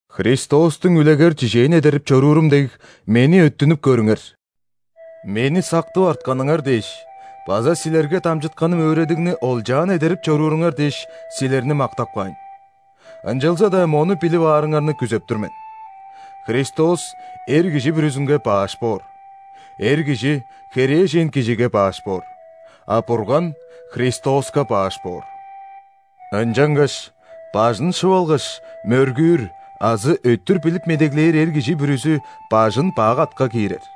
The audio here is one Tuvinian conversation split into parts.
Христостуң үлегер-чижээн эдерип чоруурум дег, мени өттүнүп көрүңер. Мени сактып артканыңар дээш база силерге дамчытканым өөредигни олчаан эдерип чорууруңар дээш, силерни мактап каайн. Ынчалза-даа мону билип аарыңарны күзеп тур мен: Христос эр кижи бүрүзүнге «баш» боор, эр кижи – херээжен кижиге «баш» боор, а Бурган – Христоска «баш» боор. Ынчангаш бажын шып алгаш, мөргүүр азы өттүр билип медеглээр эр кижи бүрүзү «бажын» бак атка киирер.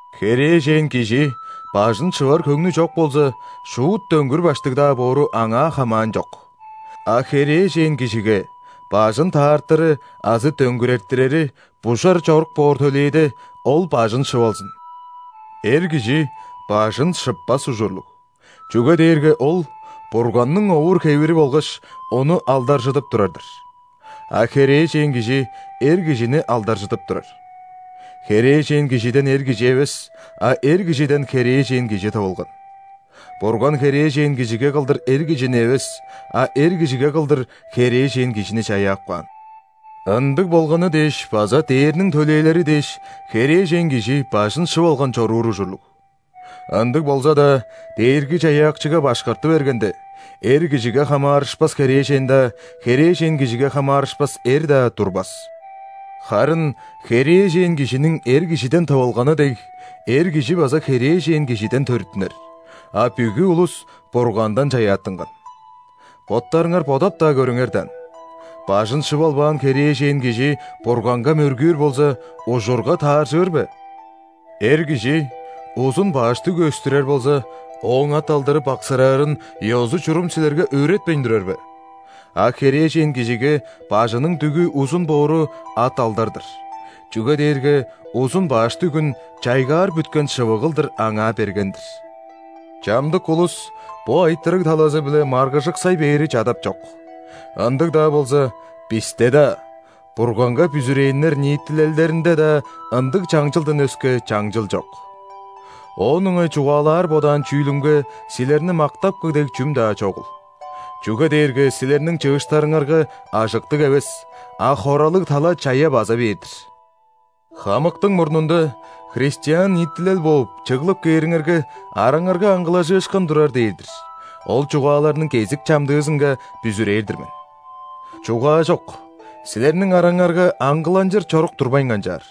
Херээжен кижи бажын шывар хөңнү чок болза, шуут дөңгүр баштыг-даа боору аңаа хамаанчок. А херээжен кижиге бажын таартыры азы дөңгүрертирери бужар чорук боор төлээде, ол бажын шып алзын. Эр кижи бажын шыппас ужурлуг, чүге дээрге ол – Бурганның овур-хевири болгаш, Ону алдаржыдып турар-дыр. А херээжен кижи – эр кижини алдаржыдып турар. Херээжен кижиден эр кижи эвес, а эр кижиден херээжен кижи тывылган. Бурган херээжен кижиге кылдыр, эр кижини эвес, а эр кижиге кылдыр, херээжен кижини чаяап каан. Ындыг болганы дээш база ·дээрниң төлээлери дээш, херээжен кижи бажын шып алган чоруур ужурлуг. Ындыг болза-даа, Дээрги-Чаяакчыга башкарты бергенде, эр кижиге хамаарышпас херээжен-даа, херээжен кижиге хамаарышпас эр-даа турбас. Харын херээжен кижиниң эр кижиден тывылганы дег, эр кижи база херээжен кижиден төрүттүнер, а бүгү улус Бургандан чаяаттынган. Боттарыңар бодап-даа көрүңер даан, бажын шып албаан херээжен кижи Бурганга мөргүүр болза, ужурга тааржыр бе? Эр кижи узун баш дүгү өстүрер болза, ооң ат-алдары баксыраарын ёзу-чурум силерге өөретпейн турар бе? А херээжен кижиге бажының дүгү узун боору – ат-алдар-дыр, чүге дээрге узун баш дүгүн чайгаар бүткен шывыг кылдыр аңаа берген-дир. Чамдык улус бо айтырыг талазы-биле маргыжыксай бээри чадапчок, ындыг-даа болза, бисте-даа, Бурганга бүзүрээннер ниитилелдеринде-даа ындыг чаңчылдан өске чаңчыл чок. Оон ыңай чугаалаар бодаан чүүлүмге силерни мактапкы дег чүм-даа чогул, чүге дээрге силерниң чыыштарыңарга ажыктыг эвес, а хоралыг тала чая база бээр-дир. Хамыктың мурнунда, христиан ниитилел бооп, чыглып кээриңерге, араңарга аңгылажыышкын турар дээр-дир, ол чугааларның кезик-чамдыызынга бүзүрээр-дир мен. Чугаажок, силерниң араңарга аңгыланчыр чорук турбайн канчаар.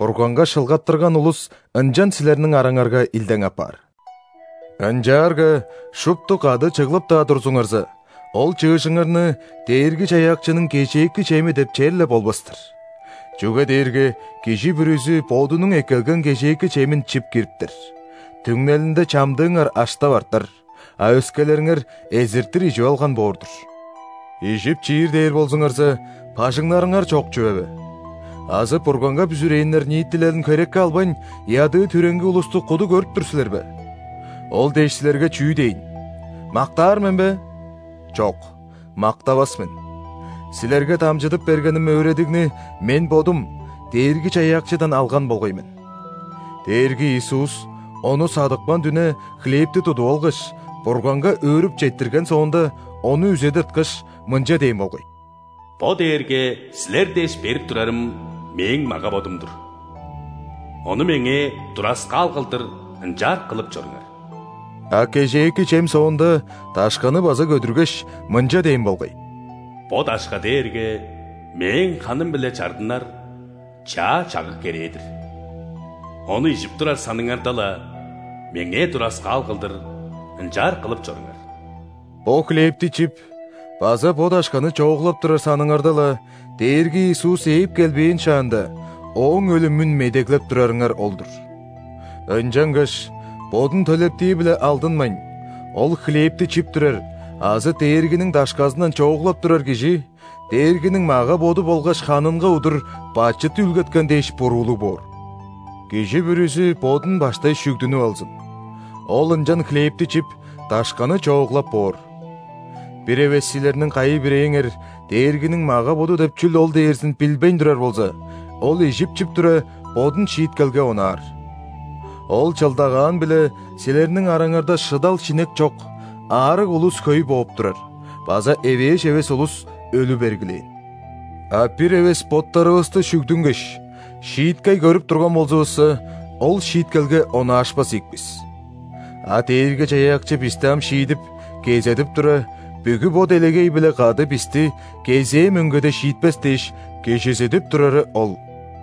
Бурганга шылгаттырган улус ынчан силерниң араңарга илдең апаар. Ынчаарга шупту кады чыглып-даа турзуңарза, ол чыыжыңарны Дээрги-Чаяакчының кежээки чеми деп черле болбас-тыр. Чүге дээрге кижи бүрүзү бодунуң эккелген кежээки чемин чип кириптер, түңнелинде чамдыыңар аштап артар, а өскелериңер эзиртир ижип алган боор-дур. Ижип-чиир дээр болзуңарза, бажыңнарыңар чок чүве бе? Азы Бурганга бүзүрээннер ниитилелин херекке албайн, ядыы-түреңги улусту куду көрүп тур силер бе? Ол дээш, силерге чүү дээйн? Мактаар мен бе? Чок, мактавас мен! Силерге дамчыдып бергеним өөредигни мен бодум Дээрги-Чаяакчыдан алган болгай мен: Дээрги Иисус Ону садыпкан дүне хлебти тудуп алгаш, Бурганга өөрүп четтирген соонда, ону үзе тырткаш, мынча дээн болгай: «Бо дээрге силер дээш берип турарым Мээң мага-бодум-дур. Ону Меңээ тураскаал кылдыр ынчаар кылып чоруңар». А кежээки чем соонда дашканы база көдүргеш, мынча дээн болгай: «Бо дашка дээрге Мээң ханым-биле чардынар чаа чагыг-керээ-дир. Ону ижип турар саныңарда-ла, Меңээ тураскаал кылдыр ынчаар кылып чоруңар». Бо хлебти чип база бо дашканы чооглап турар саныңарда-ла, Дээрги Иисус ээп келбээн шаанда, Ооң өлүмүн медеглеп турарыңар ол-дур. Ынчангаш бодун төлептии-биле алдынмайн, ол хлебти чип турар азы Дээргиниң дашказындан чооглап турар кижи Дээргиниң мага-боду болгаш ханынга удур бачыт үүлгеткен дээш буруулуг боор. Кижи бүрүзү бодун баштай шүгдүнүп алзын, ол ынчан хлебти чип, дашканы чооглап боор. Бир эвес силерниң кайы-бирээңер Дээргиниң мага-боду деп чүл ол дээрзин билбейн турар болза, ол ижип-чип тура, бодун шииткелге онаар. Ол чылдагаан-биле силерниң араңарда шыдал-шинек чок, аарыг улус хөй бооп турар база эвээш эвес улус өлү бергилээн. А бир эвес боттарывысты шүгдүнгеш, шииткей көрүп турган болзувусса, ол шииткелге онаашпас ийик бис. А Дээрги-Чаяакчы бисти ам шиидип, кезедип тура, бүгү бо делегей-биле кады бисти кезээ мөңгеде шиитпес дээш, кижизидип турары ол.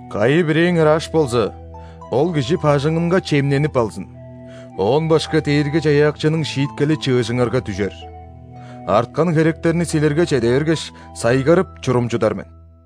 Кайы-бирээңер аш болза, ол кижи бажыңынга чемненип алзын, оон башка Дээрги-Чаяакчының шииткели чыыжыңарга дүжер. Арткан херектерни силерге чеде бергеш, сайгарып, чурумчудар мен.